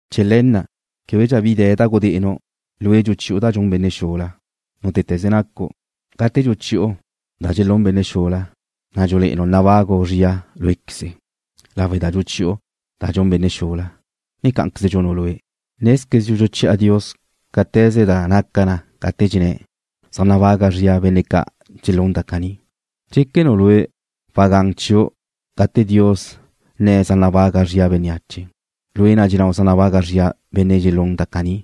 Chee̱ le̱ na' québedxa bi de̱ da gudé'enu', lue' dxuchi'u da dxun benne' xula, nútete̱ze nacu'. Gate dxuchi'u da dxun benne' xula, na' dxule'enu' nabagu' zria, lawe' da dxuchi'u da dxun benne' xula, ne cá'anqueze dxunu' lue'. Nézquezdxu dxuchi'a Dios cáte̱ze da naca na gate dxenné̱' zaj nabaga zria benne' ca' dxelún da caní. ¿Dxéquenu' lue' wadé gun ca'aze chiu' gate Dios nne̱' zaj nabaga zria bénneache, lue' na' dxennáu' zaj nabaga zria benne' dxelún da caní,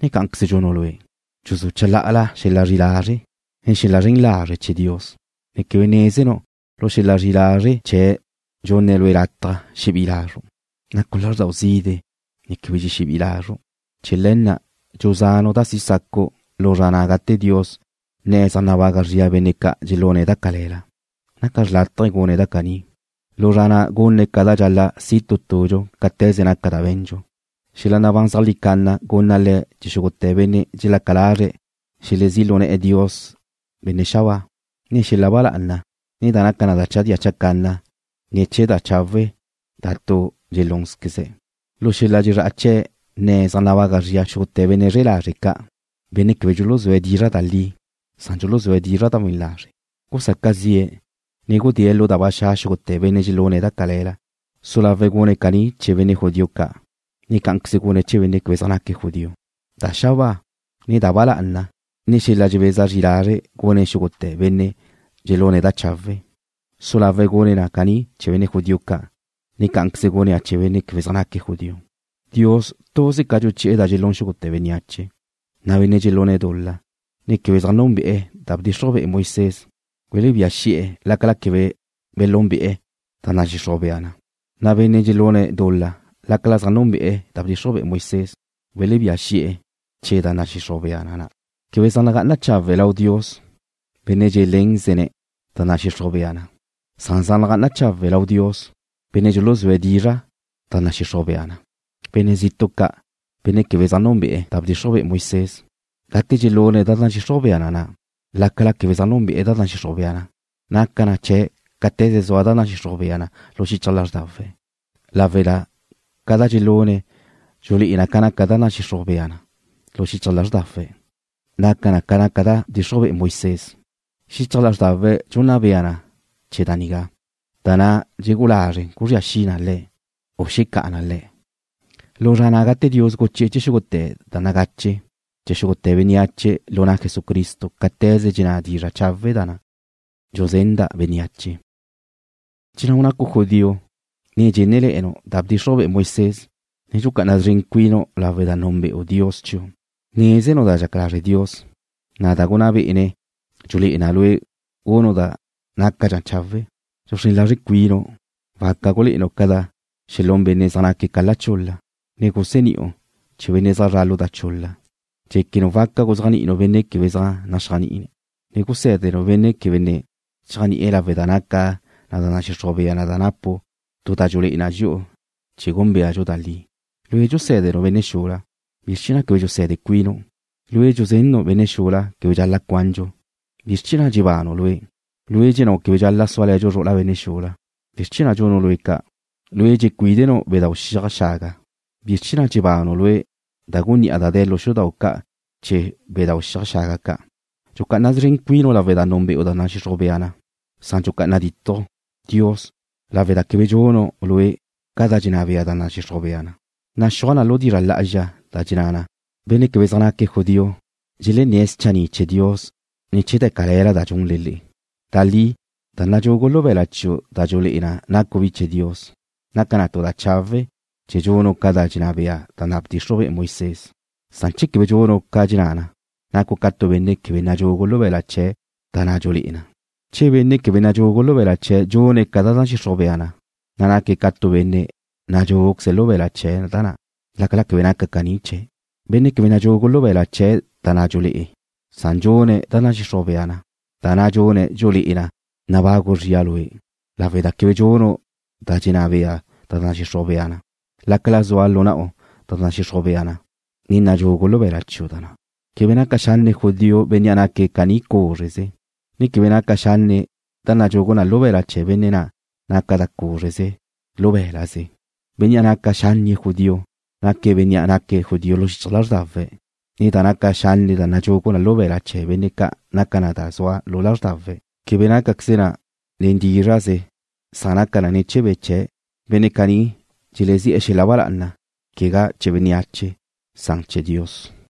ne cá'anqueze dxunu' lue'? ¿Dxuzú' chalá'ala xel-la zri'i lazre', ne xel-la zren lazre' zren chee̱ Dios, ne quebe nézenu' lu xel-la zri'i lazre' chee̱' dxunne̱' lue' lataj xebi'i lazru'? Nacu' lázrdau zide', ne quebe dxexebí'i lazru'. Chee̱ le̱ na' dxuzanu' da si sacu' lu zra na' gate Dios nne̱' zaj nabaga zria benne' ca' dxelune̱' da cale̱la. Naca xrlátaje gune̱' da caní. Lu zra na' gunne̱' ca da dxal-la' si' tu tudxu cáte̱ze naca da be̱ndxu. Xel-la nabán zeajlí canna gunna Le̱' xúgute̱ benne' dxelaca lazre̱' xelezí'e̱ lu na' Dios da xabáa, ne xel-la ba lá'ana, ne da zaj naca na da chadía chacanna ne̱ chee̱ da chawe' da tu dxelúnzqueze̱'. Lu xel-la dxezrá'a chee̱' nne̱' zaj nabaga zria xúgute̱ benne' zre'e lazre' ca', benne' quebe dxuluzúe̱' dizra' da li, san dxuluzúe̱' dizra' da we̱n lazre'. Gusaca zi'e̱, ne gudée̱' lu da ba xa' xúgute̱ benne' dxelune̱' da cale̱la. Ga su lau gune̱' caní chee̱ benne' judío ca', ne cá'anqueze gune̱' chee̱ benne' quebe zaj naque̱' judío. Da xabáa, ne da ba lá'ana, ne xel-la dxebeza zri lazre' gunne̱' xúgute̱ benne' dxelune̱' da chawe'. Ga su lau gune̱' caní chee̱ benne' judío ca', ne cá'anqueze gune̱' chee̱ benne' quebe zaj naque̱' judío. Dios tuze ca dxuchi'e̱ da dxelún xúgute̱ bénneache, na' benne' dxelune̱' dul-la, ne quebe zaj núnbe'e̱ da bdxixruj be'e Moisés welebía xi'e̱ lácala quebe belúnbe'e̱ da nadxixruj bea na, na' benne' dxelune̱' dul-la lácala zaj núnbe'e̱ da bdxixruj be'e Moisés welebía xi'e̱ ne̱ chee̱ da nadxixruj bea na na'. Quebe zaj nagá'ana chawe' lau Dios benne' dxelénzene̱' da nadxixruj bea na, san zaj nagá'ana chawe' lau Dios benne' dxuluzúe̱' dizra' da nadxixruj bea na. Benne' zitu' ca', benne' quebe zaj núnbe'e̱ da bdxixruj be'e Moisés, gate dxelune̱' ca dxenná da nadxixruj bea na na', lácala quebe zaj núnbe'e̱ da nadxixruj bea na, naca chee̱' cáte̱ze zua da nadxixruj bea na lu xichaj lázrdawe̱'. Caní naquen lawe' da ca dxelune̱' dxulé'e na zua xichaj lázrdawe̱' ca naca da nadxixruj bea na, na' naca na ca naca da bdxixruj be'e Moisés. Xichaj lázrdawe̱' dxunna bea na chee̱ da nigá, na' da dxelegú'u lazre̱' guzría xi na le̱', u xecá'a na le̱' lu zra na' gate Dios guchi'e̱ xúgute̱ da nagache' chee̱ xúgute̱ bénneache lu na' Jesucristo cáte̱ze dxenná dizra' chawe' na' da dxuzenda' bénneache. Dxennáu' nacu' judío, ne dxenné̱le̱nu' da bdxixruj be'e Moisés, ne dxucá'ana szren cuinu' lawe' da núnbe'u Dios chiu'. Nézenu' da dxaca lazre' Dios, na' da gunná bé'ene̱' dxulé'e na lue' gunu' da nácadxa chawe'. Dxuxrén lazru' cuinu' waca gulé'enu' ca da xelún benne' zaj naque̱' ca lo chul-la, ne guseni'u benne' zaj zra' lu da chul-la. Dxéquenu' waca guzéajni'inu' benne' quebe zaj naxéajni'e̱, ne gusé̱denu' benne' quebe ne cheajni'e̱ lawe' da naca da nadxixruj bea na da napu' tu da dxulé'e na dxi'u chee̱ gúnbeadxu da li. Lue' dxusé̱denu' benne' xula. ¿Bizr chee̱ na' quebe dxuse̱de cuinu'? Lue' dxuzennu' benne' quebe dxal-la' cuandxu. ¿Bizr chee̱ na' dxebanu' lue'? Lue' dxennáu' quebe dxal-la' súale̱dxu zru'ula benne' xula. ¿Bizr chee̱ na' dxunu' lue' ca'? Lue' dxecuídenu' bedáu' xiaj xaga. ¿Bizr chee̱ na' dxebanu' lue' da gunní'a da de̱ lu xudau' ca' chee̱ bedáu' xiaj xaga ca'? Dxucá'ana szren cuinu' lawe' da núnbe'u da nadxixruj bea na, san dxucá'ana ditju' Dios lawe' da quebe dxunu' lue' ca da dxenná bea da nadxixruj bea na. Naxúaj lu dizra' lá'azxa da dxenná na: Benne' quebe zaj naque̱' judío dxelenné̱' schanni' chee̱ Dios ne̱ chee̱ da cale̱la da dxunle le'e. Da li da nadxugu lu be̱la' chiu' da dxulé'e na nacu' bi chee̱ Dios, naca na tu da chawe' che dxunu' ca da dxenná bea da bdxixruj be'e Moisés, san che quebe dxunu' ca dxenná na, nacu' ca tu benne' quebe nadxugu lu be̱la' chee̱' da na' dxulé'e na. Che benne' quebe nadxugu lu be̱la' chee̱' dxune̱' ca nadxixruj bea na, naque̱' ca tu benne' nadxúguqueze lu be̱la' chee̱' da na', lácala quebe naca caní chee̱'. Benne' quebe nadxugu lu be̱la' chee̱' da na' dxulé'e na, san dxune̱' da nadxixruj bea na, da na' dxune̱' dxulé'e na nabagu' zria lue', lawe' da quebe dxunu' da dxenná bea da nadxixruj bea na, lácala zua lu na'u da nadxixruj bea na, ne nadxugu lu be̱la' chiu' da na'. Quebe naca xanne' judío bénnea' naque̱' caní cúzreze, ne quebe naca xanne' da nadxugu na lu be̱la' chee̱ benne' da naca na cúzreze, lu bé̱la'ze. Benne' naca xánnie̱' judío naque̱' bénnea' naque̱' judío lu xichaj lázrdawe̱', ne da naca xanne' da nadxugu lu be̱la' chee̱ benne' naca na da zua na lázrdawe̱'. Quebe nácaqueze na nen dízra'ze san naca na chee̱ be' chee̱'. Benne' caní dxelezi'e̱ xel-la ba lá'ana, quegá chee̱ bénneache, san chee̱ Dios.